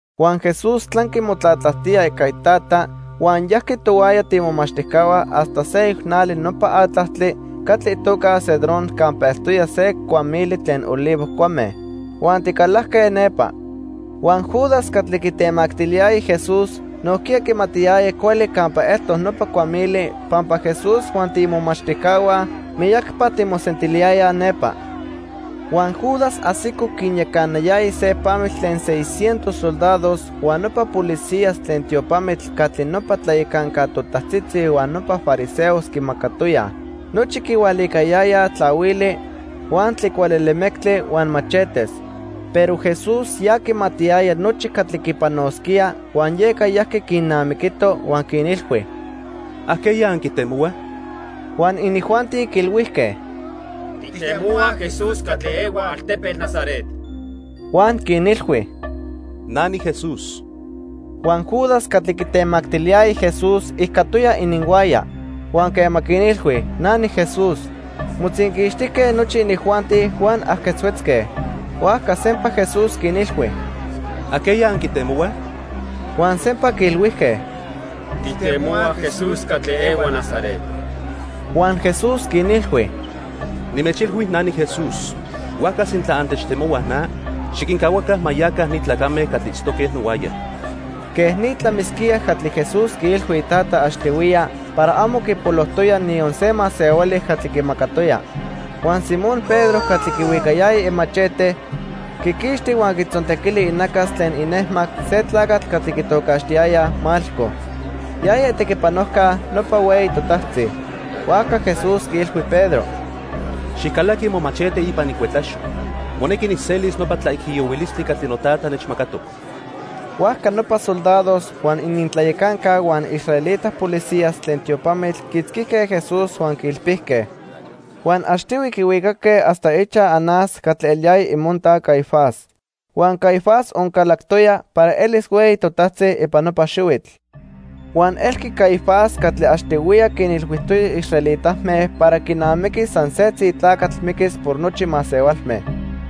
Huan Jesús tlanqui motlatlajtía ica iTata huan yajqui tohuaya tiimomachtijcahua hasta seyoc nali nopa atlajtli catli itoca Cedrón campa eltoya se cuamili tlen olivo cuame. Huan ticalajque nepa. Huan Judas catli quitemactiliyaya Jesús nojquiya quimatiyaya cuali campa eltoc nopa cuamili pampa Jesús huan tiimomachtijcahua miyacpa timosentiliyayaj nepa. Huan Judas ajsico quinyacanayaya se pamitl tlen seis cientos soldados huan nopa policías tlen tiopamitl catli nopa tlayacanca totajtzitzi huan nopa fariseos quimacatoyaj. Nochi quihualicayayaj tlahuili, huan tlicualelemectli huan machetes. Pero Jesús ya quimatiyaya nochi catli quipanosquía huan yeca yajqui quinnamiquito, huan quinilhui: —¿Ajqueya anquitemohuaj? Huan inijuanti quiilhuijque: —Tijtemohuaj Jesús catli ehua altepetl Nazaret. Huan quinilhui: —Na niJesús. Huan Judas catli quitemactiliyaya Jesús ijcatoya ininhuaya. Huan quema quinilhui: "Na niJesús", motzinquixtijque nochi inijuanti huan ajquetzhuetzque. Huajca sempa Jesús quinilhui: —¿Ajqueya anquitemohuaj? Huan sempa quiilhuijque: —Tijtemohuaj Jesús catli ehua Nazaret. Huan Jesús quinilhui: —Nimechilhui na niJesús. Huajca sintla antechtemohuaj na, xiquincahuaca ma yaca ni tlacame catli itztoque nohuaya. Quej ni tlamisquía catli Jesús quiilhui iTata achtihuiya para amo quipolojtoya niyon se masehuali catli quimacatoya. Huan Simón Pedro catli quihuicayaya imachete, quiquixti huan quitzontequili inacas tlen inejmac se tlacatl catli quitocaxtiyayaj Malco. Yaya itequipanojca nopa hueyi totajtzi. Huajca Jesús quiilhui Pedro: —Xijcalaqui momachete ipan icuetlaxo. Monequi nijselis nopa tlaijiyohuilistli catli noTata nechmacatoc. Huajca nopa soldados, huan inintlayacanca huan israelita policías tlen tiopamitl quiitzquijque Jesús huan quiilpijque. Huan achtihui quihuicaque hasta ichaj Anás catli eliyaya imonta Caifás. Huan Caifás oncalactoya para elis hueyi totajtzi ipan nopa xihuitl. Huan elqui Caifás catli achtihuiya quinilhuijtoya israelitame para quinamiqui san setzi tlacatl miquis por nochi masehualme.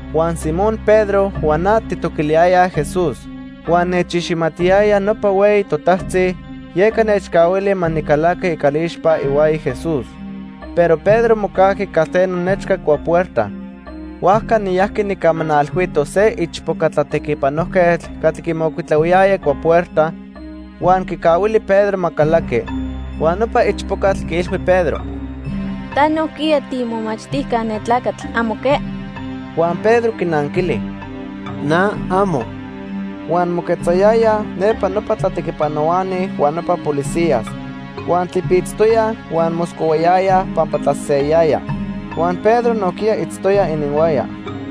Huan Simón Pedro huan na tijtoquiliyayaj Jesús. Huan nechiximatiyaya nopa hueyi totajtzi, yeca nechcahuili ma nicalaqui icalixpa ihuaya Jesús. Pero Pedro mocajqui calteno nechca cuapuerta. Huajca niyajqui nijcamanalhuito se ichpoca tlatequipanojquetl catli quimocuitlahuiyaya cuapuerta, huan quicahuili Pedro ma calaqui. Huan nopa ichpocatl quiilhui Pedro: —Ta nojquiya tiimomachtijca ne tlacatl. ¿Amo que? Huan Pedro quinanquili: —Na, amo. Huan moquetzayayaj nepa nopa tlatequipanohuani huan nopa policías. Huan tlipitztoyaj huan moscohuayayaj pampa tlaseseyayaya. Huan Pedro nojquiya itztoya ininhuaya.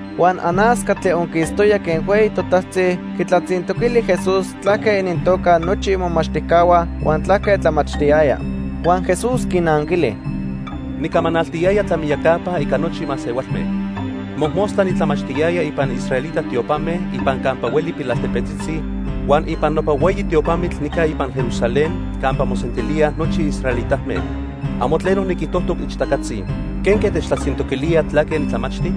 Huan Anás catli onquistoya quen hueyi totajtzi quitlatzintoquili Jesús tlaque inintoca nochi imomachtijcahua huan tlaque tlamachtiyaya. Huan Jesús quinanquili: —Nicamanaltiyaya tlamiyacapa ica nochi masehualme. Mojmostla nitlamachtiyaya ipan israelita tiopame ipan campa hueli pilaltepetzitzi huan ipan nopa hueyi tiopamitl nica ipan Jerusalén campa mosentilíaj nochi israelitame. Amo tleno niquijtojtoc ichtacatzi. ¿Quenque techtlatzintoquilía tlaque nitlamachti?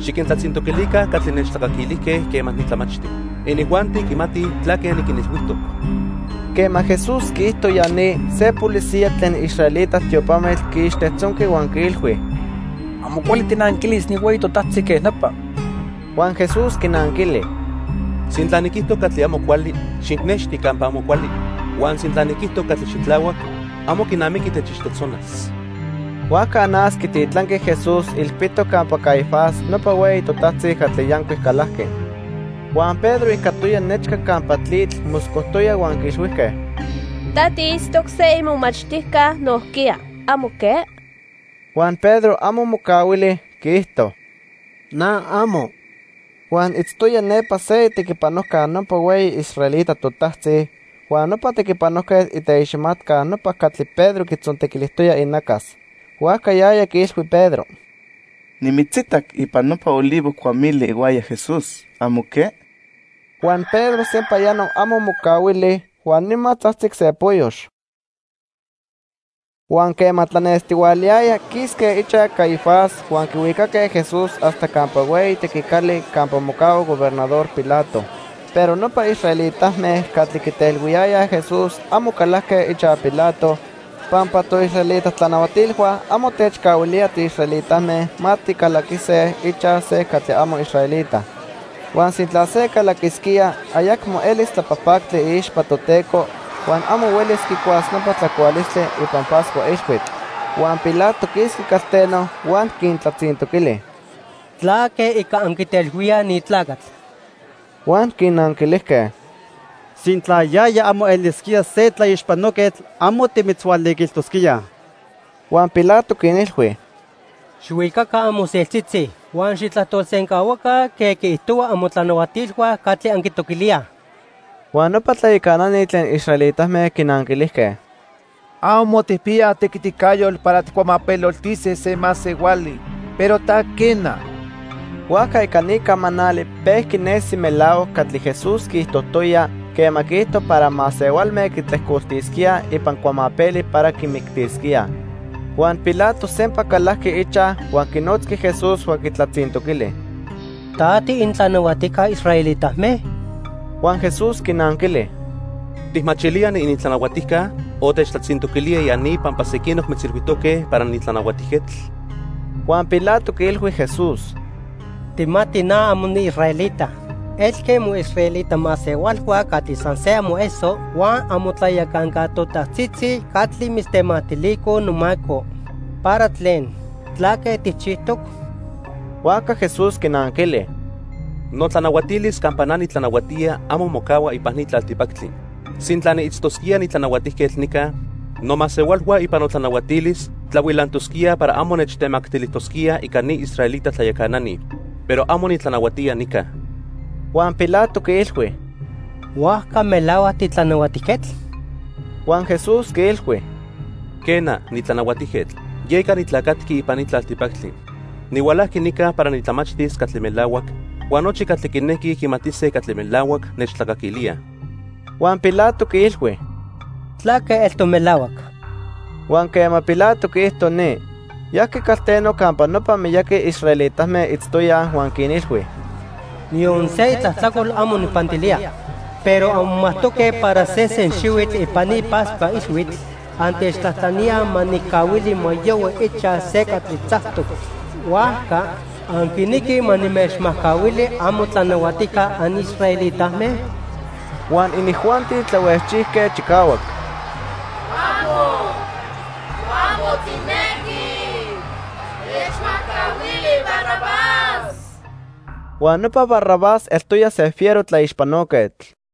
Xiquintlatzintoquilica catli nechtlacaquilijque quema nitlamachti. Inijuanti quimatij tlaque niquinilhuijtoc. Quema Jesús quiijto ya ni, se policía tlen israelita tiopamitl quiixtejtzonqui huan quiilhui: —Amo cuali tijnanquilis ni hueyi totajtzi quej nopa. Huan Jesús quinanquili: —Sintla niquijto catli amo cuali, xijnexti campa amo cuali, huan sintla niquijto catli xitlahuac, amo quinamiqui techixtejtzonas. Huajca Anás quititlanqui Jesús ilpitoc campa Caifás nopa hueyi totajtzi catli yancuic calajqui. Huan Pedro ijcatoya nechca campa tlitl moscojtoya huan quiilhuijque: —Ta tiitztoc se imomachtijca nojquiya, ¿amo que? Huan Pedro amo mocahuili, quiijto: —Na, amo. Huan itztoya nepa se itequipanojca nopa hueyi israelita totajtzi huan nopa tequipanojquetl iteiximatca nopa catli Pedro quitzontequilijtoya inacas. Huajca yaya quiilhui Pedro: —Nimitzitac ipan nopa olivo cuamili ihuaya Jesús, ¿amo que? Huan Pedro sempayano amo mocahuili, huan nima tzajtzic se poyox. Huan quema tlanestihualayaya quisque ichaj Caifás huan quihuicaque Jesús hasta campa hueyi tequicali campa mocahua Gobernador Pilato. Pero nopa israelitame catli quitelhuiyayaj Jesús amo calajque ichaj Pilato, pampa toisraelita tlanahuatilhua amo techcahuilía tiisraelitame ma ticalaquise ichaj se catli amo israelita. Huan sintla se calaquisquía, ayacmo elis tlapajpactli iixpa Toteco huan amo huelis quicuas nopa tlacualistli ipan Pascua Ilhuitl. Huan Pilato quisqui calteno huan quintlatzintoquili: —¿Tlaque ica anquitelhuíaj ni tlacatl? Huan quinanquilijque: —Sintla yaya amo elisquía se tlaixpanoquetl, amo timitzhualiquilijtosquíaj. Huan Pilato quinilhui: —Xijhuicaca amoseltzitzi huan xijtlajtolsencahuaca quen quiijtohuaj amotlanahuatilhua catli anquitoquilíaj. Huan nopa tlayacanani tlen israelitame quinanquilijque: —Amo tijpiyaj tequiticayotl para tijcuamapeloltise se masehuali, pero ta, quena. Huajca ica ni camanali pejqui nesi melahuac catli Jesús quiijtojtoya quema quiijto para masehualme quitlejcoltisquíaj ipan cuamapeli para quimictisquíaj. Huan Pilato sempa calajqui ichaj huan quinotzqui Jesús huan quitlatzintoquili: —¿Ta tiinintlanahuatijca israelitame? Huan Jesús quinanquili: —¿Tijmachilía niinintlanahuatijca o techtlatzintoquilía ya ni pampa sequinoc mitzilhuijtoque para nitlanahuatijquetl? Huan Pilato quiilhui Jesús: —Tijmati na amo niisraelita. Elque moisraelita masehualhua catli san se amoeso huan amotlayacanca totajtzitzi catli mitztemactilicoj nomaco. ¿Para tlen? ¿Tlaque tijchijtoc? Huajca Jesús quinanquili: —Notlanahuatilis campa na nitlanahuatía amo mocahua ipan ni tlaltipactli. Sintla niitztosquía nitlanahuatijquetl nica, nomasehualhua ipan notlanahuatilis tlahuilantosquíaj para amo nechtemactilijtosquíaj ica ni israelita tlayacanani. Pero amo nitlanahuatía nica. Huan Pilato quiilhui: —¿Huajca melahuac titlanahuatijquetl? Huan Jesús quiilhui: —Quena, nitlanahuatijquetl. Yeca nitlacatqui ipan ni tlaltipactli. Nihualajqui nica para nitlamachtis catli melahuac, huan nochi catli quinequij quimatise catli melahuac nechtlacaquilíaj. Huan Pilato quiilhui: —¿Tlaque eltoc melahuac? Huan quema Pilato quiijto ni, yajqui calteno campa nopa miyaqui israelitame itztoyaj huan quinilhui: —Niyon se itlajtlacol amo nijpantilía. Pero anmomajtoque para sesen xihuitl ipan ni Pascua Ilhuitl, antechtlajtlaníaj ma nijcahuili ma yohui ichaj se catli tzactoc. Huajca, ¿anquinequij ma nimechmajcahuili amotlanahuatijca anisraelitame? Huan inijuanti tlahuejchijque chicahuac: —¡Amo! ¡Amo tijnequij! Techmajcahuili Barrabás. Huan nopa Barrabás eltoya se fiero tlaixpanoquetl.